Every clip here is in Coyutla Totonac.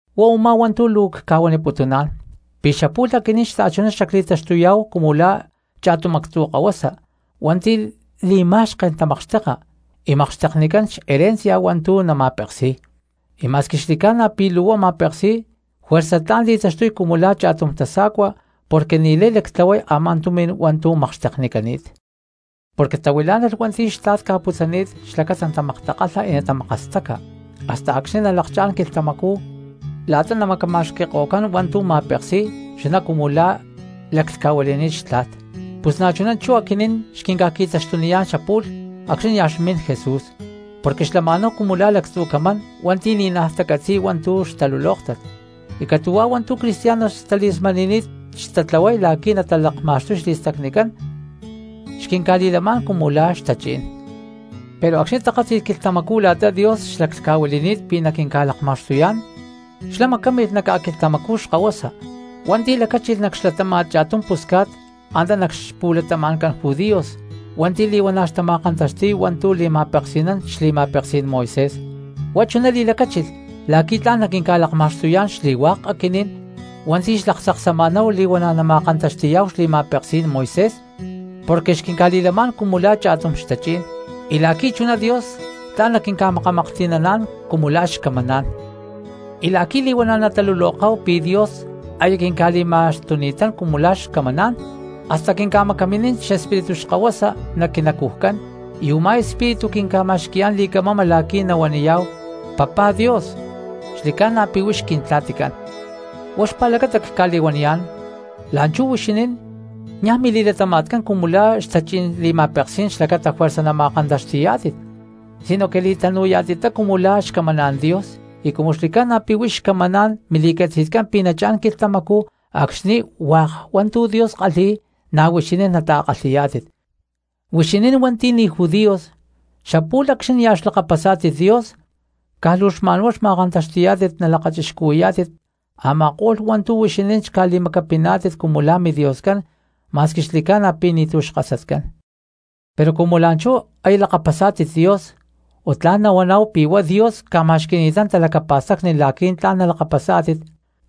Huá u̠má hua̠ntu̠ luu cca̠huaniputuná̠n pi̠ xapu̠lh aquinín xta̠chuná xli̠taxtuyá̠hu cumu la̠ cha̠tum actzu̠ kahuasa hua̠nti̠ li̠ma̠xken tamakxteka y makxteknicán xherencia hua̠ntu̠ nama̠peksi̠y, y ma̠squi xli̠ca̠na pi̠ luu huá ma̠peksi̠y juerza tla̠n li̠taxtuy cumu la̠ cha̠tum tasa̠cua porque ni̠lay lactlahuay a̠má tumi̠n hua̠ntu̠ makxteknicani̠t, porque tahuilá̠nalh hua̠nti̠ xtla̠t ca̠putzani̠t xlacata natamaktakalha y natamakastaca hasta acxni̠ nalakchá̠n quilhtamacú la̠ta namacama̠xqui̠ko̠cán hua̠ntu̠ ma̠peksi̠y chuná cumu la̠ laclhca̠huili̠ni̠t xtla̠t. Pus na̠chuná chú aquinín xquinca̠qui̠taxtuniyá̠n xapu̠lh acxni̠ nia̠ xmin Jesús, porque xlama̠náhu cumu la̠ lactzu̠ camán hua̠nti̠ ni̠naj tacatzi̠y hua̠ntu̠ xtalulóktat, y catu̠huá hua̠ntu̠ cristianos xtali̠smani̠ni̠t xtatlahuay la̠qui̠ natalakma̠xtuy xli̠stacnicán xquinca̠li̠lamá̠n cumu la̠ xtachí̠n. Pero acxni̠ takátzi̠lh quilhtamacú la̠ta Dios xlaclhca̠huili̠ni̠t pi̠ naquinca̠lakma̠xtuyá̠n xlá macámilh nac ca̠quilhtamacú xkahuasa hua̠nti̠ lacáchilh nac xlatáma̠t cha̠tum pusca̠t antá nac xpu̠latama̠ncán judíos hua̠nti̠ li̠huana̠ xtama̠kantaxti̠y hua̠ntu̠ li̠ma̠peksi̠nán xli̠ma̠peksí̠n Moisés. Huá chuná li̠lacáchilh la̠qui̠ tla̠n naquinca̠lakma̠xtuyá̠n xli̠hua̠k aquinín hua̠nti̠ xlaktzaksama̠náhu li̠huana̠ nama̠kantaxti̠yá̠hu xli̠ma̠peksí̠n Moisés porque xquinca̠li̠lamá̠n cumu la̠ cha̠tum xtachí̠n, y la̠qui̠ chuná Dios tla̠n naquinca̠makamaklhti̠naná̠n cumu la̠ xcamaná̠n. Y la̠qui̠ li̠huana̠ nataluloká̠hu pi̠ Dios aya quinca̠li̠ma̠xtuni̠tán cumu la̠ xcamaná̠n hasta quinca̠macaminín xEspíritu xkahuasa nac quinacujcán, y u̠má Espíritu quinca̠ma̠xqui̠yá̠n li̠camama la̠qui̠ nahuaniyá̠hu: “¡Papá Dios, xli̠ca̠na pi̠ huix Quintla̠ticán!” Huá xpa̠lacata cca̠li̠huaniyá̠n, la̠nchú huixinín niaj mili̠latama̠tcán cumu la̠ xtachí̠n li̠ma̠peksí̠n xlacata juerza nama̠kantaxti̠yá̠tit, sinoque li̠tanu̠yá̠tittá cumu la̠ xcamaná̠n Dios, y cumu xli̠ca̠na pi̠ huix xcamaná̠n mili̠catzi̠tcán pi̠ nachá̠n quilhtamacú acxni̠ hua̠k hua̠ntu̠ Dios kalhi̠y na̠ huixinín nata̠kalhi̠yá̠tit. Huixinín hua̠nti̠ ni̠ judíos, xapu̠lh acxni̠ nia̠ xlakapasá̠tit Dios, caj luu xma̠nhuá xma̠kantaxti̠yá̠tit nalakachixcuhui̠yá̠tit a̠ma̠ko̠lh hua̠ntu̠ huixinín xca̠li̠macapiná̠tit cumu la̠ midioscán ma̠squi xli̠ca̠na pi̠ ni̠tu̠ xkasatcán. Pero cumu la̠nchú aya lakapasni̠tátit Dios o tla̠n nahuaná̠hu pi̠ huá Dios ca̠ma̠xqui̠ni̠tán talacapa̠stacni la̠qui̠ tla̠n nalakapasá̠tit,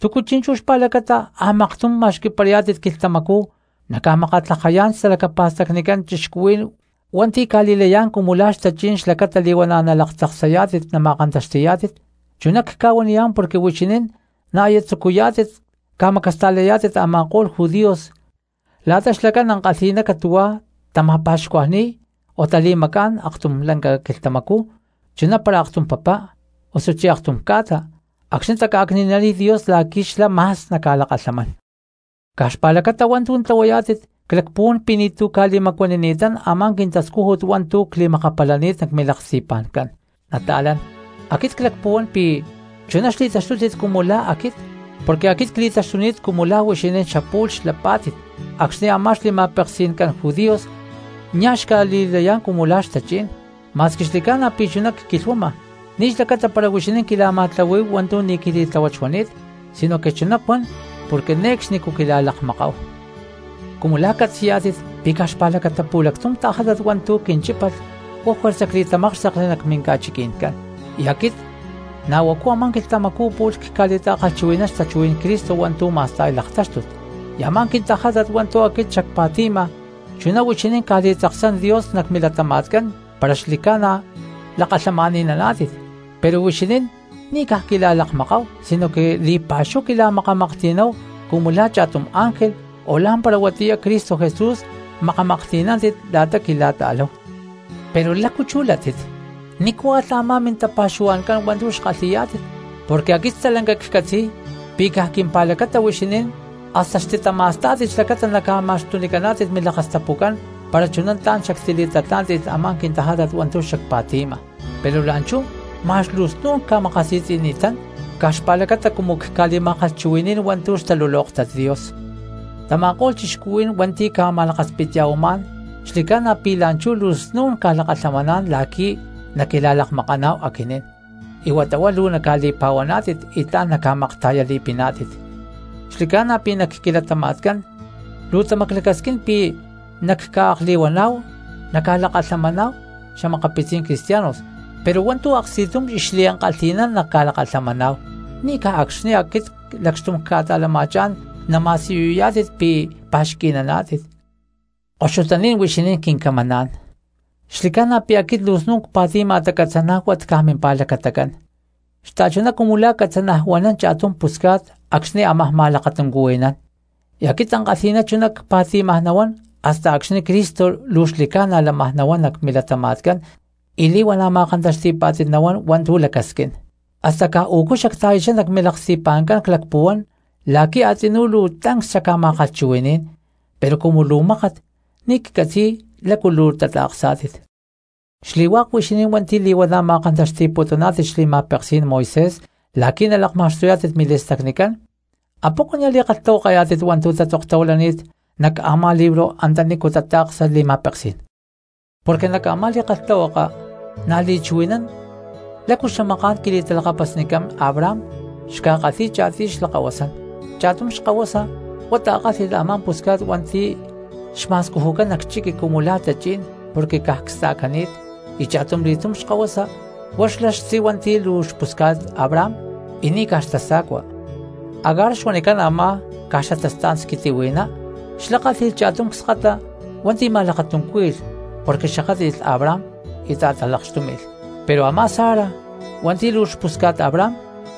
¿túcu chi̠nchú xpa̠lacata a̠maktum ma̠xqui̠parayá̠tit quilhtamacú naca̠makatlajayá̠n xtalacapa̠stacnicán cristianos hua̠ntu̠ ca̠li̠layá̠n cumu la̠ xtachí̠n xlacata li̠huana̠ nalaktzaksayá̠tit nama̠kantaxti̠yá̠tit? Chuná cca̠huaniyá̠n porque huixinín na̠ aya tzucuyá̠tit ca̠macasta̠layá̠tit a̠ma̠ko̠lh judíos la̠ta xlacán ankalhi̠ná catu̠huá tama̠pa̠xcuajni̠y, o tali̠macá̠n aktum lanca quilhtamacú chuná para aktum papá osuchí aktum ca̠ta acxni̠ taca̠cni̠naniy Dios la̠qui̠ xlá ma̠s naca̠lakalhamán. Caj xpa̠lacata hua̠ntu̠ tlahuayá̠tit clacpuhuán pi̠ ni̠tu̠ ca̠li̠macuanini̠tán a̠má quintascújut hua̠ntu̠ cli̠makapalani̠t nac milaksti̠pa̠ncán. Nata̠lán, aquit clacpuhuán pi̠ chuná xli̠taxtútit cumu la̠ aquit, porque aquit cli̠taxtuni̠t cumu la̠ huixinín xapu̠lh xlapa̠nántit acxni̠ a̠má xli̠ma̠peksi̠ncán judíos nia̠ xca̠li̠kalhi̠yá̠n cumu la̠ xtachí̠n. Ma̠squi xli̠ca̠na pi̠ chuná cquilhuama, ni̠ xlacata para huixinín quila̠ma̠tlahuí̠hu hua̠ntu̠ ni̠ quili̠tláhuat xuani̠t, sinoque chuná cuan porque ne̠cxnicú quila̠lakmakáhu. Cumu la̠ catzi̠yá̠tit pi̠ caj xpa̠lacata pu̠lactum tajátat hua̠ntu̠ quinchípalh huá juerza cli̠tamákxtekli nac minca̠chiquí̠n, y aquit na̠ huacu a̠má quilhtamacú pu̠lh cca̠li̠ma̠kalhchuhui̠ní̠n xtachuhuí̠n Cristo hua̠ntu̠ ma̠sta̠y laktáxtut. Y a̠má quintajátat hua̠ntu̠ aquit xacpa̠ti̠ma chuná huixinín ca̠li̠tzaksán Dios nac milatama̠tcán para xli̠ca̠na lakalhamani̠naná̠tit; pero huixinín ni̠ caj quila̠lakmakáhu sinoque li̠pa̠xúhu quila̠makamaklhti̠náhu cumu la̠ cha̠tum ángel, o ¡lá̠mpara huatiyá Cristo Jesús makamaklhti̠nántit la̠ta quila̠ta̠láhu! Pero ¿lácu chú látit? ¿Nícu alh a̠má mintapa̠xuhua̠ncán hua̠ntu̠ xkalhi̠yá̠tit? Porque aquit stalanca xaccatzi̠y pi̠ caj quimpa̠lacata huixinín hasta xtitama̠stá̠tit xlacata xca̠ma̠xtunicántit milakastapucán para chuná tla̠n xactili̠tatlá̠nti̠lh a̠má quintajátat hua̠ntu̠ xacpa̠ti̠ma. Pero la̠nchú ma̠x luu snu̠n cca̠makasi̠tzi̠ni̠tán caj xpa̠lacata cumu cca̠li̠ma̠kalhchuhui̠ní̠n hua̠ntu̠ xtalulóktat Dios. Tama̠ko̠lh cristianos hua̠nti̠ ca̠ma̠lakaspitya̠huamá̠n xli̠ca̠na pi̠ la̠nchú luu snu̠n ca̠lakalhamaná̠n la̠qui̠ naquila̠lakmakaná̠hu aquinín, y huata huá luu naca̠li̠pa̠huaná̠tit y tla̠n naca̠makta̠yali̠piná̠tit. Xli̠ca̠na pi̠ nac quilatama̠tcán luu tamaclacasquín pi̠ naca̠akli̠huaná̠hu naca̠lakalhamaná̠hu xa̠makapitzí̠n cristianos pero hua̠ntu̠ aksti̠tum y xliankalhi̠ná naca̠lakalhamaná̠hu, ni̠ caj acxni̠ aquit lacxtum cca̠ta̠lama̠chá̠n nama̠siyuyá̠tit pi̠ pa̠xqui̠naná̠tit. Koxutaní̠n huixinín quincamaná̠n, xli̠ca̠na pi̠ aquit luu snu̠n cpa̠ti̠ma tacatzanájuat caj mimpa̠lacatacán, xta̠chuná cumu la̠ catzanajuanán cha̠tum pusca̠t acxni̠ ámaj ma̠lakatuncuhui̠nán; y aquit ankalhi̠ná chuná cpa̠ti̠maj nahuán hasta acxni̠ Cristo luu xli̠ca̠na lámaj nahuán nac milatama̠tcán y li̠huana̠ ma̠kantaxti̠pá̠tit nahuán hua̠ntu̠ lacasquín. Hasta u̠cu xacta̠yachá nac milaksti̠pa̠ncán clacpuhuán la̠qui̠ a̠tzinú luu tancs xacca̠ma̠kalhchuhui̠ní̠n, pero cumu luu mákat, ni̠ ccatzi̠y lácu luu tata̠ksá̠tit. Xli̠hua̠k huixinín hua̠nti̠ li̠huana̠ ma̠kantaxti̠putuná̠tit xli̠ma̠peksí̠n Moisés la̠qui̠ nalakma̠xtuyá̠tit mili̠stacnicán, ¿apoco nia̠ li̠kalhtahuakayá̠tit hua̠ntu̠ tatzoktahuilani̠t nac a̠má libro antanícu tata̠ksa li̠ma̠peksí̠n? Porque nac a̠má li̠kalhtahuaka na̠ li̠chuhui̠nán lácu xamaká̠n quili̠talakapasnicán Abraham xca̠kalhi̠y cha̠tiy xlakkahuasán: cha̠tum xkahuasa huá ta̠kálhi̠lh a̠má pusca̠t hua̠nti̠ xma̠scujucán nac chiqui cumu la̠ tachí̠n porque caj csta̠cani̠t y cha̠tumli̠tum xkahuasa huá xlá xtzí hua̠nti̠ luu xpusca̠t Abraham y ni̠ caj xtasa̠cua. Agar xuanicán a̠má caj xatastá̠n squitihui̠ná, xlá kálhi̠lh cha̠tum cskata hua̠nti̠ ma̠lakatuncúhui̠lh porque xakátli̠lh Abraham y ta̠talakxtúmi̠lh, pero a̠má Sara hua̠nti̠ luu xpusca̠t Abraham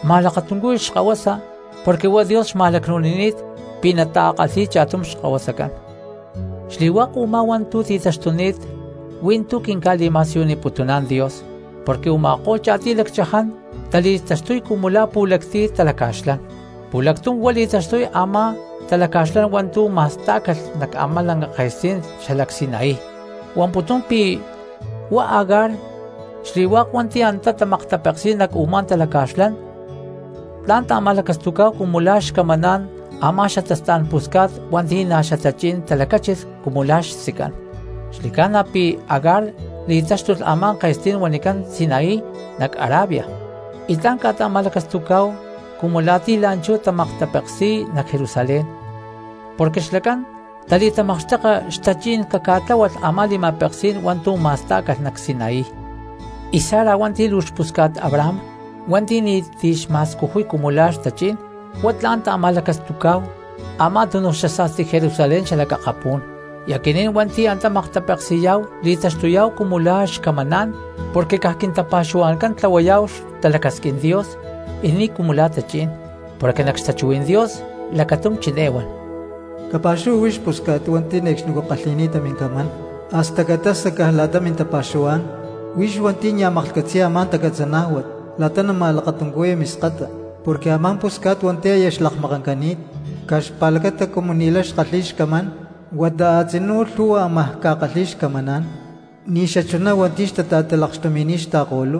ma̠lakatuncúhui̠lh xkahuasa porque huá Dios xma̠lacnu̠nini̠t pi̠ natakalhi̠y cha̠tum xkahuasacán. Xli̠hua̠k u̠má hua̠ntu̠ tikantaxtuni̠t hui̠ntú quinca̠li̠ma̠siyuniputuná̠n Dios porque u̠ma̠ko̠lh cha̠tiy lacchaján tali̠taxtuy cumu la̠ pu̠lactiy talaca̠xlán: pu̠lactum huá li̠taxtuy a̠má talaca̠xlán hua̠ntu̠ ma̠stá̠calh nac a̠má lanca ke̠stí̠n xalac Sinaí huamputún pi̠ huá Agar, xli̠hua̠k hua̠nti̠ antá tamaktapeksi̠y nac u̠má talaca̠xlán tla̠n ta̠ma̠lacastucá̠hu cumu la̠ xcamaná̠n a̠má xatastá̠n pusca̠t hua̠nti̠ na̠ xatachí̠n talacachín cumu la̠ xtzicán. Xli̠ca̠na pi̠ Agar li̠taxtuy a̠má ke̠stí̠n huanicán Sinaí nac Arabia, y tla̠n ca̠ta̠ma̠lacastucá̠hu cumu la̠ ti̠ la̠nchú tamaktapeksi̠y nac Jerusalén porque xlacán tali̠tamakxteka xtachí̠n caca̠tláhualh a̠má li̠ma̠peksí̠n hua̠ntu̠ ma̠stá̠calh nac Sinaí. Y Sara hua̠nti̠ luu xpusca̠t Abraham hua̠nti̠ ni̠ti̠ xma̠scujuy cumu la̠ xtachí̠n, huá tla̠n ta̠ma̠lacastucá̠hu a̠má tunu xasa̠sti Jerusalén xalac akapú̠n, y aquinín hua̠nti̠ antá maktapeksi̠yá̠hu li̠taxtuyá̠hu cumu la̠ xcamaná̠n porque caj quintapa̠xuhua̠ncán tlahuayá̠hu xtalacasquín Dios y ni̠ cumu la̠ tachí̠n. Porque nac xtachuhuí̠n Dios lacatum chiné huan: Capa̠xuhua huix pusca̠t hua̠nti̠ ne̠cxnicú kalhi̠ni̠ta mincamán; hasta caca̠tasa caj la̠ta mintapa̠xuhuá̠n huix hua̠nti̠ nia̠ maklhcatzi̠ya a̠má tacatzanájuat la̠ta nama̠lakatuncuhui̠ya miskata. Porque a̠má pusca̠t hua̠nti̠ aya xlakmakancani̠t caj xpa̠lacata cumu ni̠lay xkalhi̠y xcamán, huata a̠tzinú lhu̠hua ámaj ca̠kalhi̠y xcamaná̠n ni̠xachuná hua̠nti̠ xta̠talakxtumi̠ni̠t xta̠ko̠lú.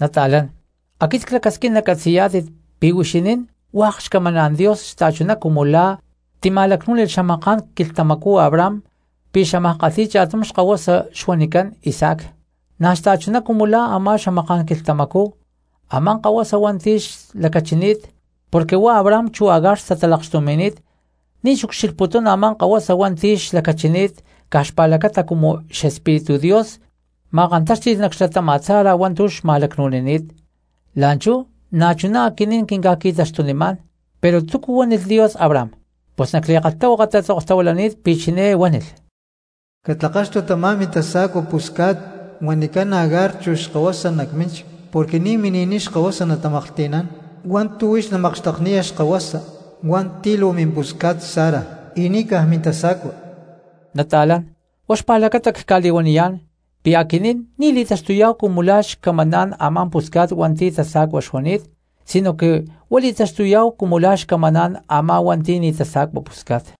Nata̠lán, aquit clacasquín nacatzi̠yá̠tit pi̠ huixinín hua̠k xcamaná̠n Dios xta̠chuná cumu la̠ tima̠lacnú̠nilh xamaká̠n quilhtamacú Abraham pi̠ xámaj kalhi̠y cha̠tum xkahuasa xuanicán Isaac. Na̠ xta̠chuná cumu la̠ a̠má xamaká̠n quilhtamacú a̠má kahuasa hua̠nti̠ xlacachini̠t porque huá Abraham chu Agar xtatalakxtumi̠ni̠t ni̠ xucxilhputún a̠má kahuasa hua̠nti̠ xlacachini̠t caj xpa̠lacata cumu xEspíritu Dios ma̠kantáxti̠lh nac xlatáma̠t Sara hua̠ntu̠ xma̠lacnu̠ni̠t, la̠nchú na̠chuná aquinín quinca̠qui̠taxtunimá̠n. Pero ¿túcu huánilh Dios Abraham? Pus nac li̠kalhtahuaka tatzoktahuilani̠t pi̠ chiné huánilh: “Catlakaxtu tamá mintasa̠cua pusca̠t huanicán Agar chu xkahuasa nac mínchic porque ni̠ mini̠niy xkahuasa natamaklhti̠nán hua̠ntu̠ huix namakxtekniya xkahuasa hua̠nti̠ luu mimpusca̠t Sara hua̠nti̠ ni̠ caj mintasa̠cua.” Nata̠lán, huá xpa̠lacata cca̠li̠huaniyá̠n pi̠ aquinín ni̠ li̠taxtuyá̠hu cumu la̠ xcamaná̠n a̠má pusca̠t hua̠nti̠ tasa̠cua xuani̠t sinoque huá li̠taxtuyá̠hu cumu la̠ xcamaná̠n a̠má hua̠nti̠ ni̠ tasa̠cua pusca̠t.